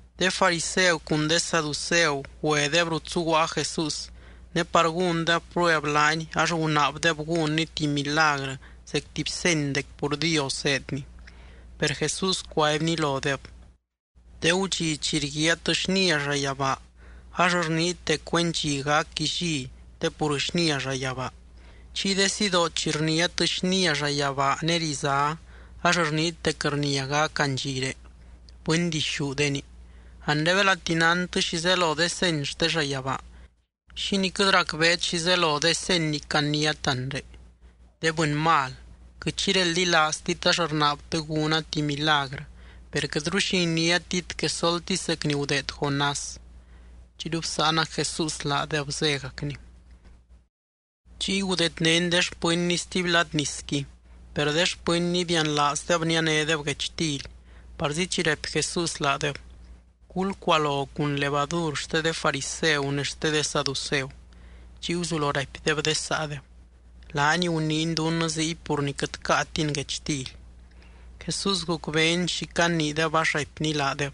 De fariseu cun de saduceu güedeb rut zuguaa Jesús, ne par gúndeb prueb laany ax gunaabdeb gúnny tuby milagrɨ zec tuby seny dec pur Dios zéedny. Per Jesús cuaibny lodeb: —De gudxi chi rguiaat xnia llayabaa, ax rniit dec güen dxi gac illí te pur xnia llayabaa. Chiy de sidoo chi rniát xnia llayabaa ne rizá, ax rniit dec rnia gac andxiré. ¡Bɨndixúdeni! Anre belati nántɨ xi zelo de seny xte llayabaa, ¿xínii quɨt racbeet xi zelo de seny ni caniát anre? ¡De bɨny mal! Quɨt xi reldilaaztit ax rnaabtɨ gúna tuby milagrɨ, per quɨtru xi iniátit quesoltisy zec ni gudeed Jonás. Chiyru bsáanac Jesús laadeb, zégacny. Chiy gudeednény de xpɨnny stuby lad nisqui, per de xpɨnny bianlaazdeb nianédeb guechtily. Parzi chi raipy Jesús laadeb: —Gulcualo cun levadur xte de fariseu ne xte de saduceu. Chiy guzulo raipdeb de saadeb: —Laany guniiny dunnɨ ziy pur ni quɨt caatin guechtily. Jesús gucbeeny xi caniideb ax raipny laadeb: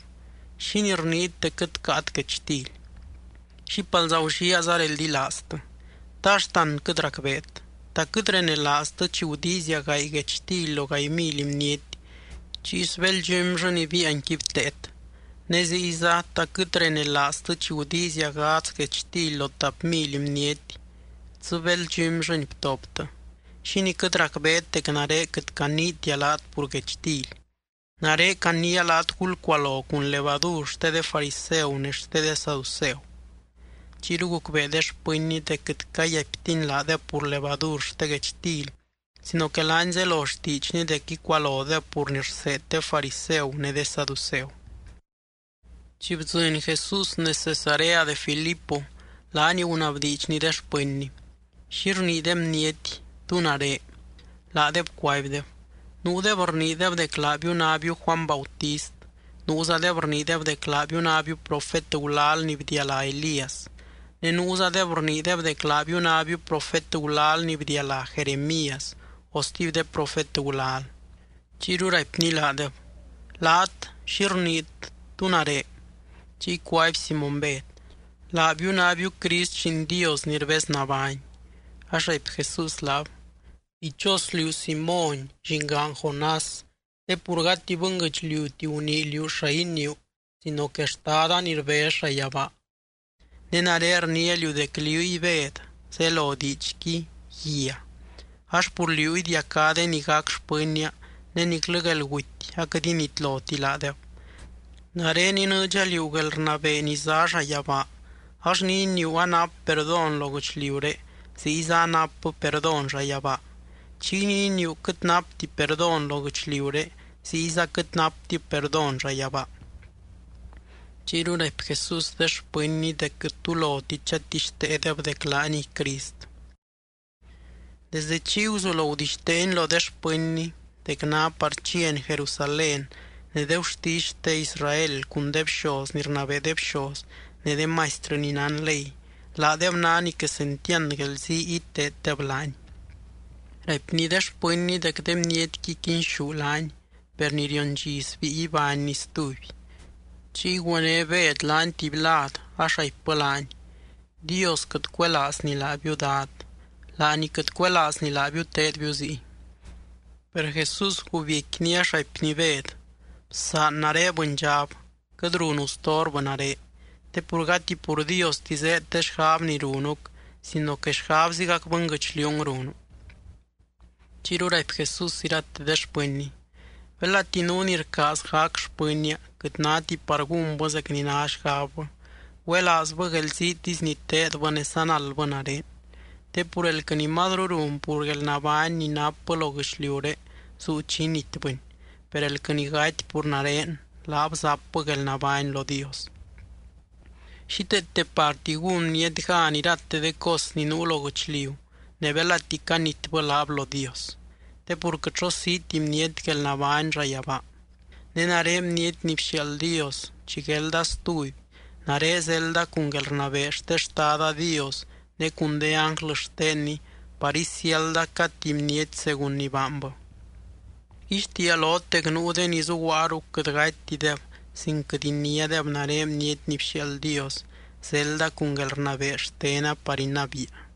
—¿Xínii rniit dec quɨt caat guechtily? ¡Xípalza gulliaaza reldilaaztɨ! ¿Ta axtan quɨt racbeet? ¿Ta quɨt renelaaztɨ chi gudiizia gaay guechtily lo gaay mily bniety, chiy sbéld dxumyllɨ ni biianqui bteet? Ne ziyza, ¿ta quɨt renelaaztɨ chi gudiizia gadz guechtily lo tap mily bniety, dzɨ béld dxumyllɨni btoptɨ? ¿Xínii quɨt racbeet dec nare quɨt caniitia laat pur guechtily? Nare caniia laat gulcualo cun levadur xte de fariseu ne xte de saduceu. Chiyru gucbee de xpɨnny dec quɨt cayaiptiny laadeb pur levadur xte guechtily sino que laany zelo xtiidxny dec icualodeb pur ni rseed de fariseu ne de saduceu. Chi bdzɨny Jesús nez Cesarea de Filipo, laany gunabdiidxny de xpɨnny: —¿Xi rnii de bniety, tú nare? Laadeb cuaibdeb: —Nuudeb rniideb dec laabiu nábiu Juany Bautist. Nuuzadeb rniideb dec laabiu nábiu profet gulal ni bdialá Elías. Ne nuuzadeb rniideb dec laabiu nábiu profet gulal ni bdialá Jeremías o stuby de profet gulal. Chiyru raipny laadeb: —Laat, ¿xi rniit, tú nare? Chiy cuaby Simóny Bed: —Laabiu nábiu Crist, Lliin Dios ni rbez nabány. Ax raipy Jesús laab: —Dichos liú Simóny, llingaan Jonás, te pur gati bɨnguɨchliuti gunii liú xa iniiu sino que Xtada ni rbez llayabaa. Ne nare rniia liú dec liúy Bed, zelo diidxqui “guia”, ax pur liú idiacá de ni gac xpɨnnia ne niclɨ guelguty aquɨt initloti laadeb. Nare inɨɨdxa liú guelrnabee ni zá llayabaa, ax ni iniiu anap perdón lo guɨchliuré ziyza anapbɨ perdón llayabaa. Chiy ni iniiu quɨt napti perdón lo guɨchliuré ziyza quɨt naptib perdón llayabaa. Chiyru raipy Jesús de xpɨnny dec quɨt tu loti chatixteedeb dec laaniy Crist. Desdɨ chiy guzulo gudixteeny lo de xpɨnny dec ná par chiany Jerusalén, ne de gurtisy xte Israel cun de bxoz ni rnabee de bxoz ne de maistrɨ ni nán ley, laadeb ná ni quesentiand guelzii iteeddeb laany. Raipny de xpɨnny dec de bnietqui quinxú laany, per ni rion dxi sbíi ibánny stuby. Chiy güené Bed laany tuby lad, ax raipbɨ laany: —¡Dios quɨt cuelaazny laabiu, Dad! ¡Laany quɨt cuelaazny laabiu teedbiu ziy! Per Jesús gubiecquiny, ax raipny Bed: —¡Bsaan nare, bɨndxab!, quɨt runu storbɨ nare. Te pur gati pur Diosti zéed de xgab ni runuc sino que xgabzigac bɨnguɨchliung runu. Chiyru raipy Jesús irate de xpɨnny: —Belati nuu ni rcaaz gac xpɨnnia quɨt náti par gúnbɨ zec ni ná xgabbɨ, güelaazbɨ guelziitisy ni teedbɨ ne sanaldbɨ nare. Te pur elquɨ ni mazru run pur guelnabány ni napbɨ lo guɨchliuré zuu chi initbɨni. Per elquɨ ni gaty pur nare, laab zapbɨ guelnabány lo Dios. Xíteete parti gún bniety gan irate de cos ni nuu lo guɨchliu ne belati canitbɨ laab lo Dios. Te pur quɨt xo siiti bniety guelnabány llayabaa. Ne nare Bniety ni bxiaald Dios, chi guelda stuby, nare zelda cun guelrnabee xte Xtada Dios ne cun de ánglɨ xtenny par isiálda cad tuby bniety según ni baanbɨ. Rguixtiia lot dec nuu de ni zuguaa ruc quɨt gatytideb sin quɨt iniádeb nare Bniety ni bxiaald Dios, zelda cun guelrnabee xtena par inabiia.